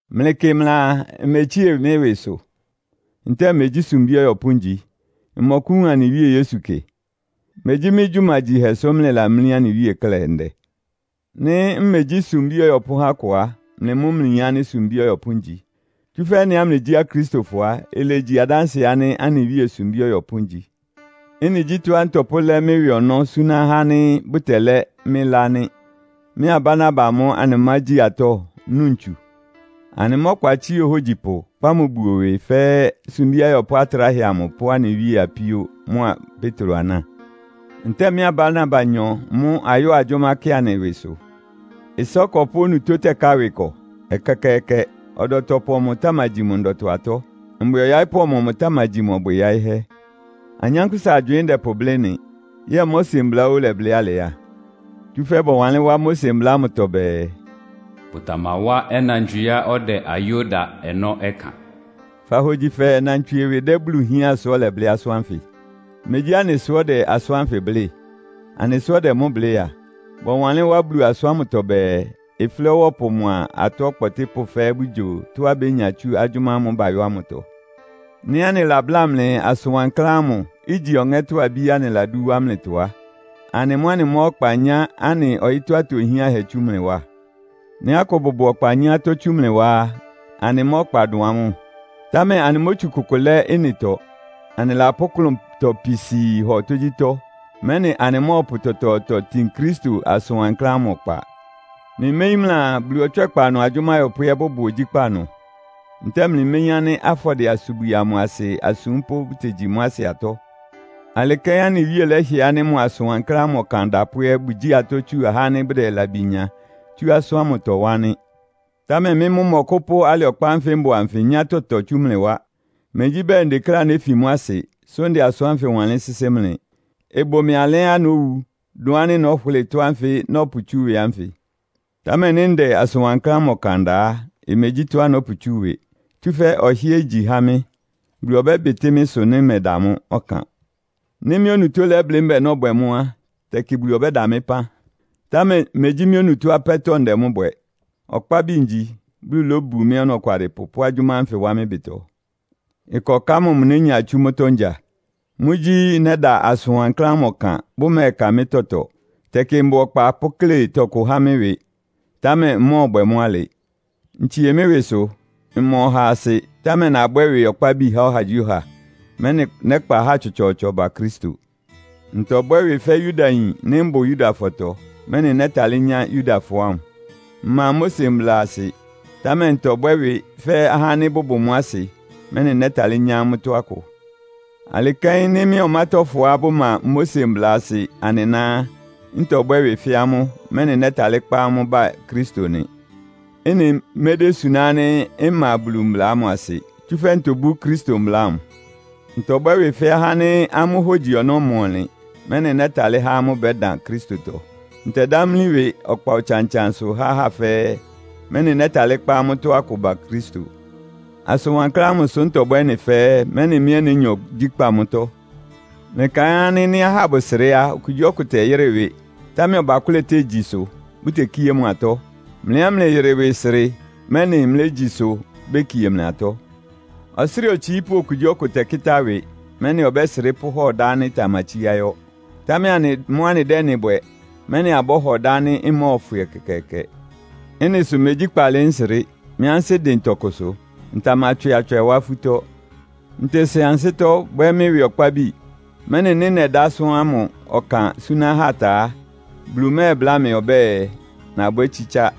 Mlɩkɩ mlɩaa mmetsie mɩ́ ɩwɩsʋ? Ntɛ́ɛ megyí sumbí ɔyɔpʋ́ ngyi? Mmɔkʋ́wun anɩ Wíe Yesu kɩ? Megyí mɩ́ gyumagyihɛ sʋ́ mlɩlamlí anɩ Wíe klɛ́ ndɛ? Nɩ́ mmegyí sumbí ɔyɔpʋ́ há akʋ á, mlɩ mʋ́ mlɩyin ánɩ́ sumbí ɔyɔpʋ́ ngyi. Tsúfɛ́ ɩ́nɩá mlɩgyí Akristofɔ á, ilegyi adánsɩɛ ánɩ́ anɩ Wíe sumbí ɔyɔpʋ́ ngyi. Ɩ́nɩ gyí tɔ́á ntɔpʋ́lɛ́ mɩ́ ɩwɩ ɔnɔ́ súná ahá ánɩ́ bʋtɛlɛ́ mɩ́ ɩlá nɩ́. Mɩ́a Barnaba mʋ́ anɩmágyi atɔ́, nu ntsu? Anɩmá ɔkpa tsía ohógyipʋ, kpá mʋ buo ɩwɩ, fɛ́ sumbí ayɔpʋ́ atráhɛ amʋ pʋ́ anɩ Wíe apíó mʋ́a Petro aná? Ntɛ́ɛ mɩ́a Barnabanyɔ mʋ́ ayɔ́ɔ agyʋ́má kɩ anɩ ɩwɩsʋ? Ɩsá ɔkɔpʋ́ onutó tɛ́ká ɩwɩ ɩkɔ? Ɛkɛkɛɛkɛ! Ɔdɔtɔpʋ ɔmɔmʋ tamagyi mʋ ndɔtɔ-atɔ́? Mbwɩ ɔyaɩ́pʋ́ ɔmɔmʋ tamagyi mʋ ɔbwɩ yáɩ́hɛ́? Anyánkpʋ́sa agywɩɩn ndɛpʋblɩ́ ɩ́nɩ? Yɛ́ɛ Mose Mbla óó ɩlɛblɩ́ alɩ á? Tsúfɛ́ bɔwanlɩ́n wá Mose Mbla ámʋtɔ bɛɛ, “Bʋtamawá ɔnantswieá ɔdɛ ayó da ɔnɔ́ ɩkan.” Fahogyi fɛɛ nnantswie ɩwɩ dɛ́ Bulu hián sʋ́ ɔlɛblɩ́ asʋ́n ánfɩ? Megyí anɩ sʋ́ ɔdɛ asʋ́n ánfɩ blɩ́? Anɩ sʋ́ ɔdɛ mʋ́ blɩ́ a. Bɔwanlɩ́n wá Bulu asʋ́n ámʋtɔ bɛɛ, “Ɩflɛ́ ɔwɔ́pʋ mʋa atɔ́ ɔkpɔtɩ́pʋ́ fɛ́ɛ́ bʋgyo tɔ́á bénya tsú agyʋ́má ámʋ́ʋ́ bayɔ́ ámʋtɔ.” Nɩ́ anɩlabláa mlɩ asʋn wankláán ámʋ, igyi ɔŋɛ́tɔ́ abíá anɩladú wá mlɩtɔ á, anɩ mʋ́ anɩmá ɔkpa nyá anɩ ɔyɩ́tɔ́ atohiánhɛ tsú mlɩ wá? Nɩ́ akʋ bʋbʋ ɔkpa nyá atɔ́ tsú mlɩ wá á, anɩmá ɔkpa dʋn amʋ́? Támɛ anɩmótsu kʋkʋ lɛ́ ɩ́nɩtɔ. Anɩlapʋ́ klʋntɔ pisii hɔ tógyítɔ́, mɛ́nɩ anɩmɔ́ɔpʋ tɔtɔɔtɔ tin Kristo asʋn wankláán ámʋ ɔkpa. Mlɩméyín mlɩaa, Bulu ɔtswɛ́kpa ɩnʋ agyʋ́má ayɔpʋ́ ɛ́ bʋbʋ ogyíkpá ɩnʋ? Ntɛ́ɛ mlɩméyín ánɩ́ afɔdɩɛ-asubwi amʋ asɩ asúmpʋ́ bʋtegyi mʋ́ asɩ atɔ́? Alɩ kɛ́n anɩ Wíe lɛ́hɩɛ ánɩ́ mʋ asʋn wankláán ámʋ ɔkan adapʋ́ ɛ́ bʋgyíi atɔ́ tsu ahá ánɩ́ bʋdɛ labi nya tsú asʋ́n ámʋtɔ wá nɩ́. Támɛ mɩ́ mʋ́ mmɔkʋ́pʋ́ alɩ ɔkpa ánfɩ mbʋ anfɩ nyá tɔtɔ tsú mlɩ wá. Megyí bɛɛ ndekléá néfi mʋ́ asɩ, sʋ́ ndɛ asʋ́n ánfɩ wanlɩ́n sɩ́sɩ́ mlɩ. Ɩbʋ mɩ́ alɛ́á nówu, dʋn ánɩ́ nɔ́hʋlɩ́ɩ ɩtɔ́ ánfɩ nɔ́pʋtsú ɩwɩ ánfɩ. Támɛ nɩ́ ndɛ asʋn wankláán ámʋ ɔkan da a, imegyí tɔ́á nɔ́pʋtsú ɩwɩ. Tsúfɛ́ ɔhɩ́ɛ́ igyi há mɩ́. Bulu ɔbɛ́bɩtɩ́ mɩ́ ɩsʋ nɩ́ mmɛda mʋ́ ɔkan. Nɩ́ mɩ́ onutó lɛ́blɩ́ mbɛ́ɛ nɔ́bwɛ mʋ́ á, tɛkɩ Bulu ɔbɛ́da mɩ́ ɩpán. Támɛ megyí mɩ́ onutó apɛ́tɔ́ ndɛ mʋ́ bwɛ. Ɔkpábi ngyi, Bulu lóbu mɩ́ ɔnɔkwalɩpʋ pʋ́ agyʋ́má ánfɩ wá mɩ́ ɩbɩtɔ. Ɩkɔká mɔmʋ nénya tsú mʋ́tɔ́ ngya? Mʋ́gyí nɛ́da asʋn wankláán ámʋ ɔkan, bʋmɛ́ɛka mɩ́ tɔtɔ. Tɛkɩ mbʋ ɔkpa pʋ́kle tɔkʋ há mɩ́ ɩwɩ, támɛ mmɔ́ɔbwɛ mʋ́ alɩ. Ntsie mɩ́ ɩwɩsʋ. Mma ɔhaa asɩ, támɛ nabwɛ́ ɩwɩ ɔkpábi há ɔhagyíɔha, mɛ́nɩ nɛ́kpa ahá tsɔtsɔɔtsɔ ba Kristo. Ntɔbwɛ́ ɩwɩ fɛ́ Yudayin nɩ́ mbʋ Yudafɔtɔ, mɛ́nɩ nɛ́talɩ́ nyá Yudafɔ ámʋ. Mma Mose mbla asɩ, támɛ ntɔbwɛ́ ɩwɩ fɛ́ ahá ánɩ́ bʋbʋ mʋ́ asɩ, mɛ́nɩ nɛ́talɩ́ nyá amʋ́tɔ́ akʋ. Alɩ kɛ́n nɩ́ mɩ́a ɔmátɔ́fɔá bʋma Mose mbla asɩ anɩná á, ntɔbwɛ́ ɩwɩ fɛ́ amʋ́, mɛ́nɩ nɛ́talɩ́ kpá amʋ́ ba Kristo nɩ. Ɩ́nɩ medésuná ánɩ́ mma Bulu mbla ámʋ asɩ, tsúfɛ́ ntobú Kristo mbla ámʋ. Ntɔbwɛ́ ɩwɩ fɛ́ ahá ánɩ́ amʋ́ hógyi ɔnɔ́ ma ɔnlɩn, mɛ́nɩ nɛ́talɩ́ há amʋ́ bɛ́dan Kristotɔ. Ntɛdamlí ɩwɩ ɔkpa ɔtsan-ɔtsansʋ há ahá fɛ́ɛ́, mɛ́nɩ nɛ́talɩ́ kpá amʋ́tɔ́ akʋ ba Kristo. Asʋn wankláán ámʋ sʋ́ ntɔbwɛ́ ɩ́nɩ fɛ́ɛ́, mɛ́nɩ mɩ́ ɛ́ nénya ogyíkpá mʋ́tɔ́. Mlɩkaɩn ánɩ́ nɩ́ ahá bʋsrɩ́ a, okugyíɔkʋ tɛyɩ́rɩ ɩwɩ, támɛ ɔbakʋ́lɛ tégyi ɩsʋ, bʋtekíé mʋ atɔ́? Mlɩ ɛ́ mlɩyɩrɩ ɩwɩ srɩ, mɛ́nɩ mlégyi ɩsʋ, békie mlɩ atɔ́. Ɔsrɩ́ɩ otsiípʋ́ okugyíɔkʋ tɛkɩ́tá ɩwɩ, mɛ́nɩ ɔbɛ́srɩ́ pʋ́hɔ ɩdá ánɩ́ ɩtamatsíá yɔ́. Támɛ anɩ mʋ́ anɩdɛ́ ɩ́nɩ bwɛ, mɛ́nɩ abɔ́hɔ ɩdá ánɩ́ ɩmɔ́ɔfwɩ ɛkɛkɛɛkɛ. Ɩ́nɩ sʋ megyí kpaalɩ nsrɩ́. Mɩ́ ansɩ́ dɩn tɔkʋsʋ. Ntamatswɩ atswɛ wá afútɔ́. Ntesen ansɩ́tɔ́, bwɛ́ mɩ́ ɩwɩ ɔkpábi, mɛ́nɩ nɩ́ nɛdá asʋ́n ámʋ ɔkan súná ahá ta á, Bulu mɛ́ɛbláa mɩ ɔbɛ́ɛ, nabwɛ́ tsítsá.